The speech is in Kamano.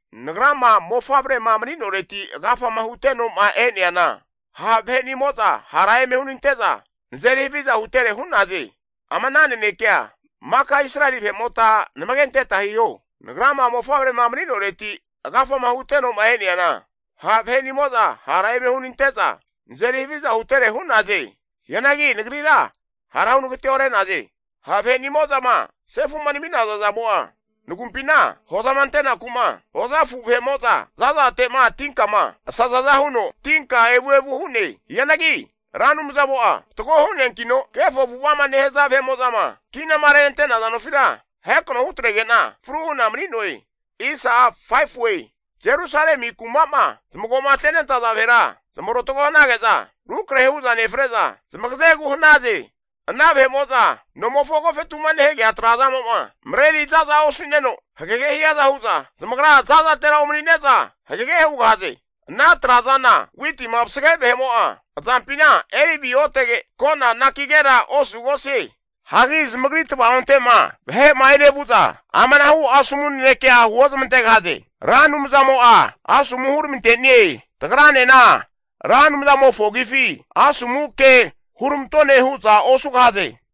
Nagrama mofavrema mani'noreti agafama huteno'ma e'neana, ha' vahe'nimo'za hara eme hunante'za nazeri haviza hutere hu'naze. Ama ana nanekea maka Israeli vahe'mota namage anteta hiho. Nagrama mofavrema mani'noreti agafama huteno'ma e'neana, ha' vahenimo'za hara eme hunante'za nazeri haviza hutere hu'naze. Hianagi nagrira hara hunagateore'naze. Ha' vahe'mo'zama sefu'ma nami'naza zamo'a nagumpina, hozama antenaku'ma hozafu vahe'mo'za zazate'ma tinkama asazaza huno tinka evu evu hu'ne. Hianagi Ra Anumzamo'a fatgo hu'neankino, kefo avu'ava'ma nehaza vahe'mo'zama kinama renante'naza nofira ahekano hutrege'na fru hu'na mani'noe. Jerusalemi kuma'ma zamago'ma tenentaza vahera, zamarotago hanage'za rukrahe hu'za nefre'za zamagazegu hanaze. Ana vahe'mo'za nomofo agofetu'ma nehagea trazamo'ma mareri za'za osu'neno hagege hiaza hu'za, zamagra zazatera omanine'za hagege hugahaze. Ana trazana witima vasage vahe'mo'a azampina eri aviotege, kona anakigera osugosie. Hagi zamagri tvaonte'ma vahe'ma enevu'za amanahu asomu nanekea huozmantegahaze. Ra Anumzamo'a asomu huramante'nie. Tagranena Ra Anumzamofo agifi asomu ke huramantone hu'za osugahaze.